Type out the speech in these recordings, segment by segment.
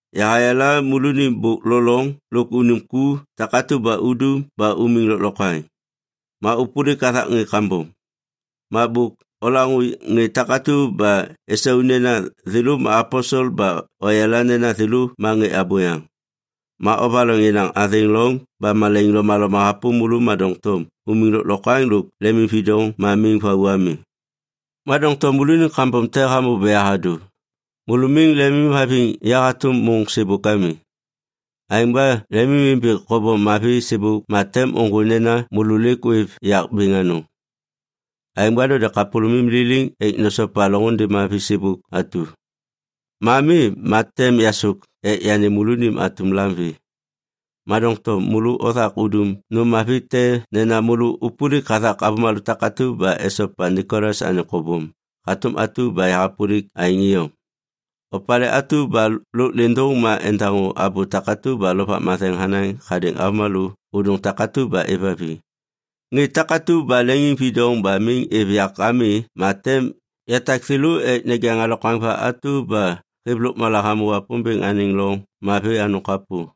Yahayala môlônim bôk lo loŋ lôk unim ku takatu ba udum ba umiŋ lôklokwaŋ. Ma ôpôlik hathak ŋê kambom. Ma bôk olaŋô ŋê takatu ba esau nena thêlô ma aposel ba oyala nena thêlô ma ŋê abôyaŋ. Ma ovaloŋ yenaŋ athêŋ loŋ ba malaiŋ lomaloma hapôm môlô ma doŋtom umiŋ lôklokwaŋ lôk lemimvidoŋ ma miŋ vau ami. Ma doŋtom môlônim kambom te hamô ba yahadô. Môlô miŋ lemimhaviŋ ya hatôm môŋ sêbôk ami. Aêŋ ba lemimimbi kobom mavi sêbôk ma tem ôŋgô nena môlô lêk ôêv yak bêŋ anôŋ. Aêŋ ba node kapôlômim liliŋ ek nosopa loŋôndê mavi sêbôk atu. Ma mi ma tem yasôk ek yanêm môlônim atum lam vê. Ma doŋtom môlô othak udum nôm mavi te nena môlô ôpôlik hathak avômalô takatu ba esopa Nikolas anêŋ kobom hatôm atu ba yahapôlik aêŋ iyom. Opalê atu ba lôk lêndôŋ ma endaŋô abô takatu ba Lovak Matheŋ hanaŋ hadêŋ avômalô ôdôŋ takatu ba êvhaviŋ. Ŋê takatu ba leŋiŋvidoŋ ba miŋ êv yak ami ma tem yatak thêlô ek nejaŋ alokwaŋ va atu ba hêv lôkmala hamô Wapômbêŋ anêŋ loŋ mavi anôŋ kapô.”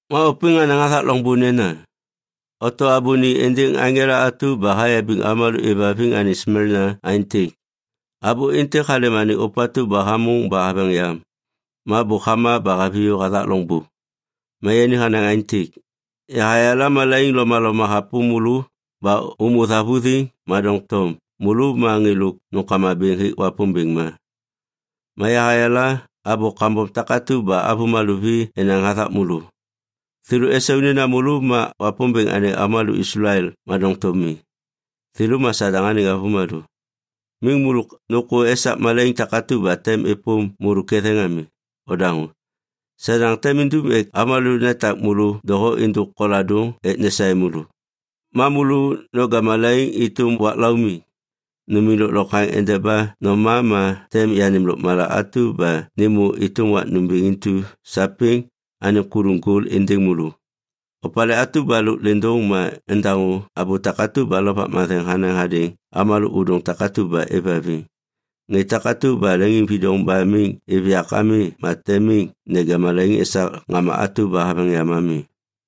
Ma ôpêŋ hanaŋ hathak loŋbô nena, “Oto abô ni êndêŋ aŋela atu ba hayabiŋ avômalô êvhaviŋ anêŋ Smelna aêntêk: Abô êntêk halêm anêŋ ôpatu ba hamôŋ ba haveŋ yam ma bôk hama ba haviyô hathak loŋbô. Ma yani hanaŋ aêntêk: Yahayala malaiŋ lomaloma hapôm môlô ba ômô thavuthiŋ, ma doŋtom môlô ma ŋê lôk nômkama bêŋ hêk Wapômbêŋ ma. Ma yahayala abô kambom takatu ba avômalô vi enaŋ hathak môlô. Thêlô esau nena thêlô ma Wapômbêŋ anêŋ avômalô Islael ma doŋtom mi. Thêlô ma Sadaŋ anêŋ avômalô. Miŋ môlô nôkô esak malaiŋ takatu ba tem êpôm môlô ketheŋ ami. Odaŋô! Sadaŋ tem indum ek avômalô netak môlô doho êndôk koladôŋ ek nesaê môlô. Ma môlô noja malaiŋ êtôm wak laumiŋ. Numiŋ lôklokwaŋ endeba noma ma tem yanêm lôkmala atu ba nêmô êtôm wak nômbêŋ intu sapêŋ anêŋ kuluŋ gol êndêŋ môlô. Opalê atu ba lôk lêndôŋ ma endaŋô abô takatu ba Lovak Matheŋ hanaŋ hadêŋ avômalô ôdôŋ takatu ba êvhaviŋ. Ŋê takatu ba leŋiŋvidoŋ ba miŋ êv yak ami ma tem miŋ neja malaiŋ esak ŋama atu ba haveŋ yam ami.”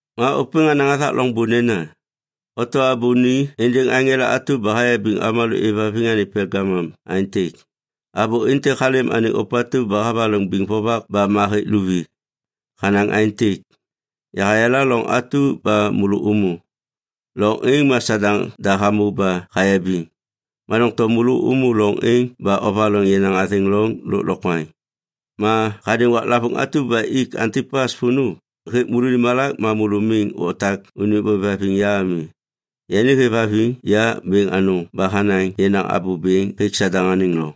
Ma ôpêŋ hanaŋ hathak loŋbô nena, “Oto abô ni êndêŋ aŋela atu ba hayabiŋ avômalô êvhaviŋ anêŋ Pelgamum aêntêk: Abô êntêk halêm anêŋ ôpatu ba havaloŋ biŋ vovak ba ma hêk luvi. Hanaŋ aêntêk: Yahayala loŋ atu ba môlô ômô. Loŋ êŋ ma Sadaŋ da hamô ba hayabiŋ, ma doŋtom môlô ômô loŋ êŋ ba ovaloŋ yenaŋ athêŋ loŋ lôklokwaŋ. Ma hadêŋ waklavôŋ atu ba ik Antipas vônô hêk môlônim malak ma môlô miŋ otak unim ôêvhaviŋ ya ami. Yani hêvhaviŋ ya bêŋ anôŋ ba hanaŋ yenaŋ abô bêŋ hêk Sadaŋ anêŋ loŋ.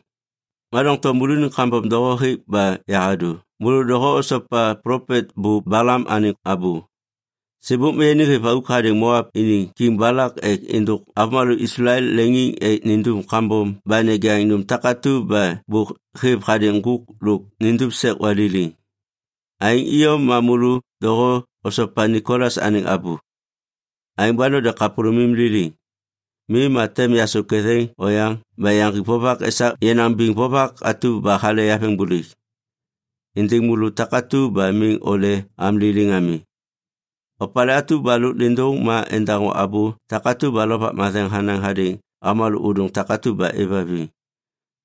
Ma doŋtom môlônim kambom doho hêk ba yahadô. Môlô doho osopa plopet bô Balam anêŋ abô. Sêbôk ma yani hêv auk hadêŋ Moap iniŋ kiŋ Balak ek êndôk avômalô Islael leŋiŋ ek nindum kambom ba nejaŋ nôm takatu ba bôk hêv hadêŋ ŋgôk lôk nindum sek waliliŋ. Aêŋ iyom ma môlô doho osopa Nikolas anêŋ abô. Aêŋ ba node kapôlômim liliŋ. Mi ma tem yasôk ketheŋ oyaŋ ba yaŋgik vovak esak yenaŋ biŋ vovak atu ba hale yaveŋbôlêk êndêŋ môlô takatu ba miŋ ole am liliŋ ami. Opalê atu ba lôk lêndôŋ ma endaŋô abô takatu ba Lovak Matheŋ hanaŋ hadêŋ avômalô ôdôŋ takatu ba êvhaviŋ.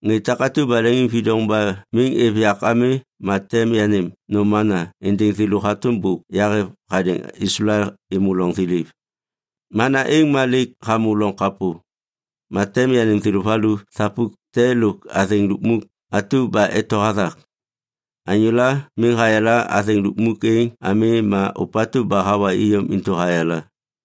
Ŋê takatu ba leŋiŋvidoŋ ba miŋ êv yak ami ma tem yanêm nôm ‘mana’ êndêŋ thêlô hatôm bôk yahêv hadêŋ Islael êmô loŋ thiliv. Mana êŋ ma lêk hamô loŋ kapô. Ma tem yanêm thêlô valu thapuk te lôk athêŋ lukmuk atu ba eto hathak. Anyôla miŋ hayala athêŋ lukmuk êŋ ami ma ôpatu ba hawa iyom intu hayala.”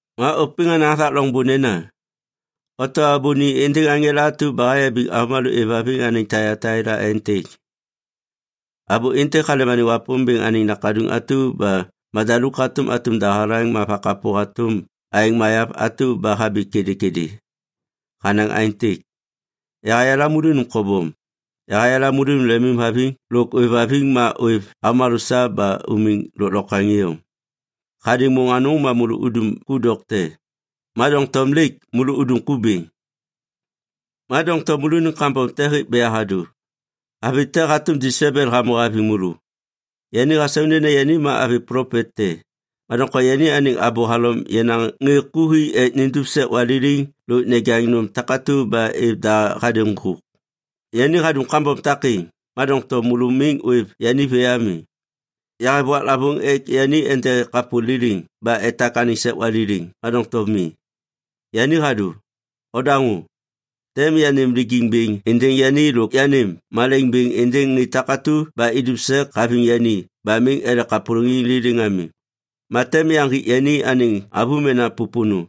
Ma ôpêŋ hanaŋ hathak loŋbô nena, “Oto abô ni êndêŋ aŋela atu ba hayabiŋ avômalô êvhaviŋ anêŋ Taiataila aêntêk: Abô êntêk halêm anêŋ Wapômbêŋ anêŋ Nakaduŋ atu ba madaluk hatôm atum dahalaŋ ma vakapô hatôm aeŋ mayav atu ba habi kêdêkêdê. Hanaŋ aêntêk: Yahayala môlônim kobom. Yahayala môlônim lemimhaviŋ lôk ôêvhaviŋ ma ôêv avômalô sa ba umiŋ lôklokwaŋ iyom. Hadêŋ môŋ ma môlô udum ku dokte, ma doŋtom lêk môlô udum ku bêŋ. Ma doŋtom môlônim kambom te hêk ba yahadô. Avi te hatôm Jesebel hamô haviŋ môlô. Yani hasau nena yani ma avi plopet te, ma doŋtom yani anêŋ abô halom yenaŋ ŋê ku ek nindum sek waliliŋ lôk nejaŋ nôm takatu ba êv da hadêŋ ŋgôk. Yani hadum kambom takêŋ, ma doŋtom môlô miŋ ôêv yani vê ami! Yahêv waklavôŋ ek yani ende kapô liliŋ ba etak anêŋ sek waliliŋ, ma doŋtom mi. Yani hadô. Odaŋô! Tem yanêm lijiŋ bêŋ êndêŋ yani lôk yanêm malaiŋ bêŋ êndêŋ ŋê takatu ba idum sek haviŋ yani ba miŋ ele kapôlôŋiŋ liliŋ ami. Ma tem yaŋgik yani anêŋ avômena pôpônô.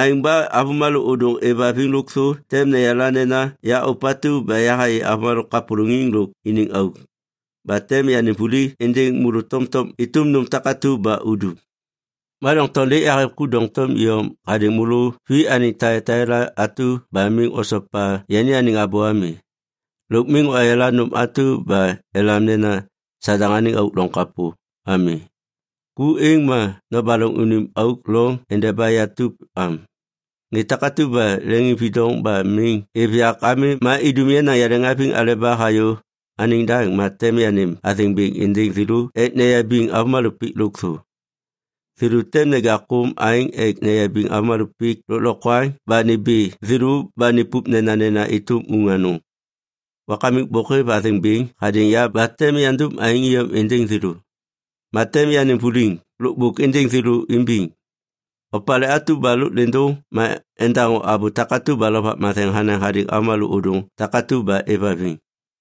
Aêŋ ba avômalô ôdôŋ êvhaviŋ lôkthô tem neyala nena ya ôpatu ba yahayê avômalô kapôlôŋiŋ lôk iniŋ auk. Ba tem yanêm vuli êndêŋ môlô tomtom êtôm nôm takatu ba udum. Ma doŋtom lêk yahêv ku doŋtom iyom hadêŋ môlô vi anêŋ Taiataila atu ba miŋ osopa yani anêŋ abô ami. Lôk miŋ oyala nôm atu ba elam nena, ‘Sadaŋ anêŋ auk loŋ kapô’ ami. Ku êŋ ma nobaloŋ unim auk loŋ endeba yatup am. Ŋê takatu ba leŋiŋvidoŋ ba miŋ êv yak ami ma idum yenaŋ yaleŋhaviŋ aleba hayô anêŋ daŋ, ma tem yanêm athêŋ bêŋ êndêŋ thêlô ek neyabiŋ avômalô pik lôkthô. Thêlô tem neja kôm aeŋ ek neyabiŋ avômalô pik lôklokwaŋ ba nimbi thêlô ba nipup nenanena êtôm uŋ anôŋ. Wakamik bôk hêv athêŋ bêŋ hadêŋ ya ba tem yandum aêŋ iyom êndêŋ thêlô. Ma tem yanêm vuliŋ lôkbôk êndêŋ thêlô imbiŋ. Opalê atu ba lôk lêndôŋ ma endaŋô abô takatu ba Lovak Matheŋ hanaŋ hadêŋ avômalô ôdôŋ takatu ba êvhaviŋ.”